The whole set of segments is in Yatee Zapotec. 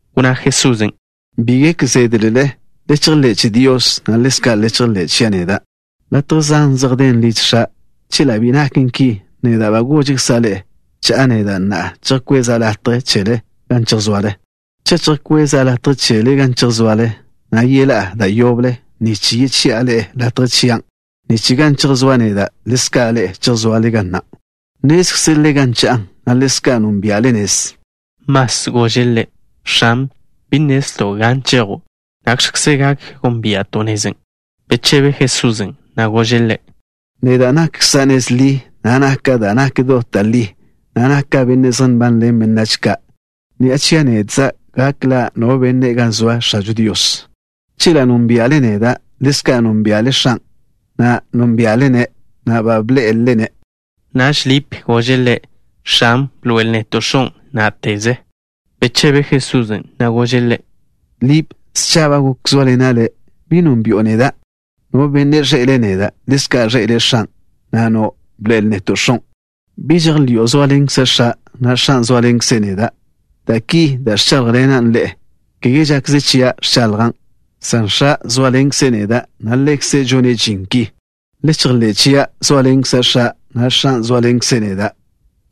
Wnná Jesusen': —Bi gek zédlele. Le chejḻé' che Dios, na' le chejḻé' chia' neda'. Latje zan zej den liž X̱a'. Chela' bi naken ki, neda' ba gožkza' ḻe'e. Cha'a neda' na'a, chejkweza' latje chele gan chejsoale. Cha' chejkweza' latje chele gan chejsoale, na' yeḻá'a da' yoble, nich yechi'a ḻe'e latje chian', nich gan chejsóa' neda', ḻezka' ḻe'e chejsoale ga na'. Nnézkzelele gan cha'a, na' ḻezka' nónbia'le nez. Mas gože' Ḻe': —X̱an, bi nnezlto' gan chejo'. ¿Nakx̱kze gak gónbia'to' nezen'? Bechebe Jesusen', na' gože' ḻe': —Neda' nakkza' nez ḻi, na' naka' da' nak dot da' li, na' naka' Benne' zej nbanḻen benách ka'. Ni'a chia' nedza' gak ḻa' no benne' gan zoa X̱ažo Dios. Chela' nónbia'le neda', ḻezka' nónbia'le X̱an'. Na'a, nónbia'le-ne' na' ba bḻé'elele-ne'. Naž Lip gože' Ḻe': —X̱an, bḻoe'el neto' X̱on', ná'teze. Bechebe Jesusen', na' gože' ḻe': —Lip, scha ba goken zóaḻena' ḻe'e. ¿Bi nónbi'o neda'? No benne' ẕḻe'ele' neda', ḻezka' ẕḻe'ele' X̱an'. ¿Na'a nno': “Bḻoe'el neto' X̱on'”? ¿Bi žejḻi'o zóaḻenkza' X̱a', na' X̱an' zóaḻenkze' neda'? Da' ki da' ẕcháḻjḻena' ḻe'e, kege žakze chia' ẕchaḻjan', san X̱a' zóaḻenkze' neda', na' Ḻekze' žone' žin ki. Le chejḻé' chia', zóaḻenkza' X̱a', na' X̱an' zóaḻenkze' neda'.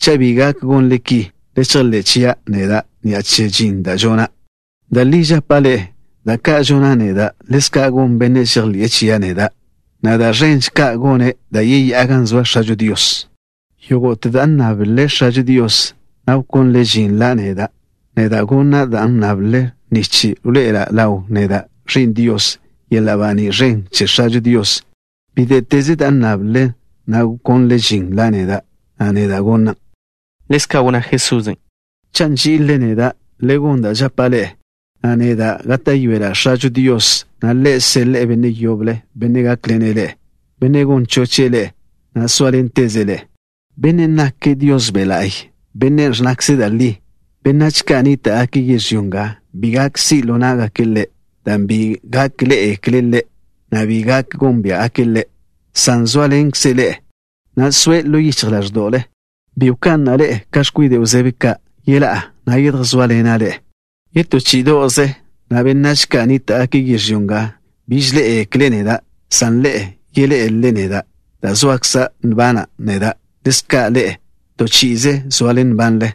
Cha' bi gak gonle ki, le chejḻé' chia' neda' ni'a che žin da' žona'. Da' li žapa' ḻe'e: da' ka' žona' neda', ḻezka' gon bennen' žejḻi'e chia' neda', na' da' ẕenže ka' gone' dan' yeyá'a gan zoa X̱ažo Dios. Yógo'te da' nnáblele X̱ažo Dios, na' wkónlele žin la' neda', neda' gona' dan' nnable, nich wḻoe'ela' ḻaw neda', Ẕi'n Dios, yeḻa' baní' ẕen che X̱ažo Dios. Bíte'teze dan' nnable, na' wkónlele žin la' neda', neda' gonan'. Ḻezka' wnná Jesusen': —Cha' nží'ilele neda', le gon da' žapa' ḻe'e, na' neda' gáta'yoela' X̱ažo Dios, na' Ḻe' seḻe'e Benne' yoble, Benne' gákḻene' ḻe'e, Benne' gon choche' ḻe'e, na' sóaḻenteze' ḻe'e. Bennen' nake' Dios Be' La'y, Benne' ẕnnakze' da' li. Benách ka' nníta'gake' yežlyó nga bi gak si' ḻo ná'gake' Ḻe', dan' bi gak ḻé'egekle' Ḻe', na' bi gak gónbia'gake' Ḻe', san zóaḻenkze' ḻe'e, na' soe' ḻo yichj ḻáẕdo'le. Bi wka'na' ḻe'e ka x̱kwide' wzéb ka'. Yeḻá'a, na' yedjsóaḻena' ḻe'e. Yetó chí'ido'ze, na' benách ka' nníta'gake' yežlyó nga biž ḻé'egekle' neda', san ḻe'e yeḻé'elele neda'. Dan' zoakza' nbana' neda', ḻezka' ḻe'e, to chi'ize soale nbanle.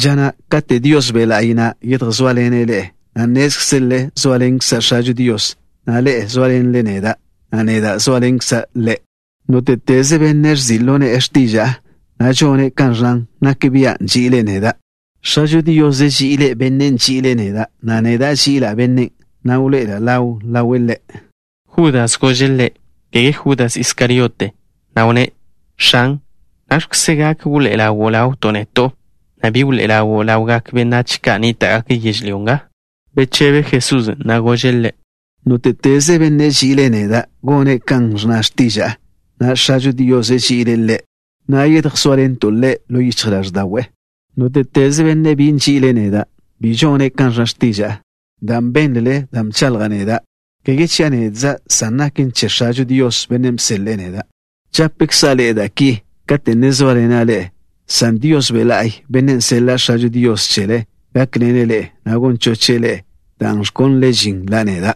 Ža na' katen' Dios Be' La'y na' yedjsóaḻene' ḻe'e, nnézkzelele zóaḻenkza' X̱ažo Dios, na' ḻe'e zóaḻenle neda', na' neda' zóaḻenkza' ḻe'e. Nóte'teze benne' ẕzi' ḻo ne'e x̱tiža'a, na' žone' kan ẕnnan, nak bia' nži'ile' neda'. X̱ažo Dios ži'ile' bennen' nži'ile' neda', na' neda' ži'ila' bennen', na' wḻoé'e ḻawa' ḻawe' ḻe'. Judas gože' Ḻe', (kege Judas Iskariote), na' wnné': —X̱an, ¿nakx̱kze gak wḻoé'e ḻawo' ḻawto' neto', na' bi wḻoé'e ḻawo' ḻawgak benách ka' nníta'gake' yežlyó nga? Bechebe Jesusen', na' gože' ḻe': —Nóte'teze benne' nži'ile' neda' gone' kan ẕnna x̱tiža'a, na' X̱ažo Dios ži'ile' ḻe', na' yedjsóaḻento' ḻe' ḻo yichj ḻáẕda'we'. Nóte'teze benne' bi nži'ile' neda' bi žone' kan ẕnna x̱tiža'a. Da' bénlele, da' bchaḻja' neda', kege chia' nedzan', san naken che X̱ažo Dios, Bennen' bseḻe'e neda'. ’Žapkza' ḻe'e da' ki kate' ne zóaḻena' ḻe'e, san Dios Be' La'y, Bennen' seḻa' X̱ažo Dios chele, gákḻene' ḻe'e, na' gon choche' ḻe'e dan' wkónlele žin la' neda'.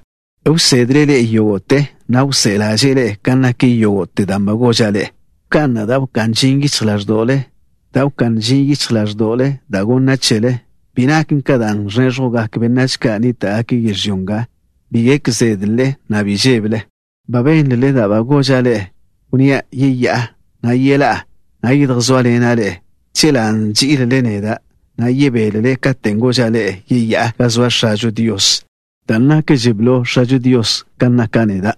Wsedle' ḻe'e yógo'te, na' wsé'e ḻáže'le kan nak yógo'te da' ba goža' ḻe'e. ’Wka'na' da' wká'n ži yichj ḻáẕdo'le. Dan' wká'n ži yichj ḻáẕdo'le da' gonna' chele, bi naken ka da' ẕnéẕjwgak benách ka' nníta'gake' yežlyó nga. Bi gek zédlele, na' bi žébele. Ba bénlele da' ba goža' ḻe'e, wnnía': yeyá'a, na' yeḻá'a, na' yedjsóaḻena' ḻe'e. Chela' nží'ilele neda', na' yebélele katen' goža' ḻe'e yeyá'a gan zoa X̱ažo Dios, dan' nakže blo X̱ažo Dios ka naka' neda'.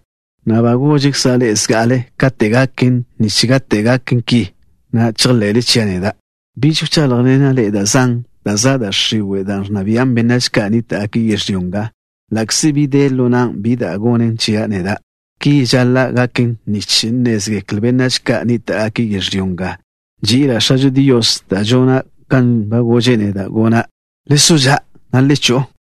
Na'a, ba goža' ḻe'e zga'ale kate' gaken, nich kate' gaken ki, chejḻe'le chia' neda'. ’Biž wcháḻjḻena' ḻe'e da' zan, dan' za' da' x̱iwe', dan' ẕnna bian' benách ka' nníta'gake' yežlyó nga. Ḻa'kze bi de ḻo nan' bi da' gonen chia' neda', ki žaḻa' gaken nich nnézgekle benách ka' nníta'gake' yežlyó nga nži'ila' X̱ažo Dios, na' žona' kan ba gože' neda' gona'. Le so ža', na' le cho'o.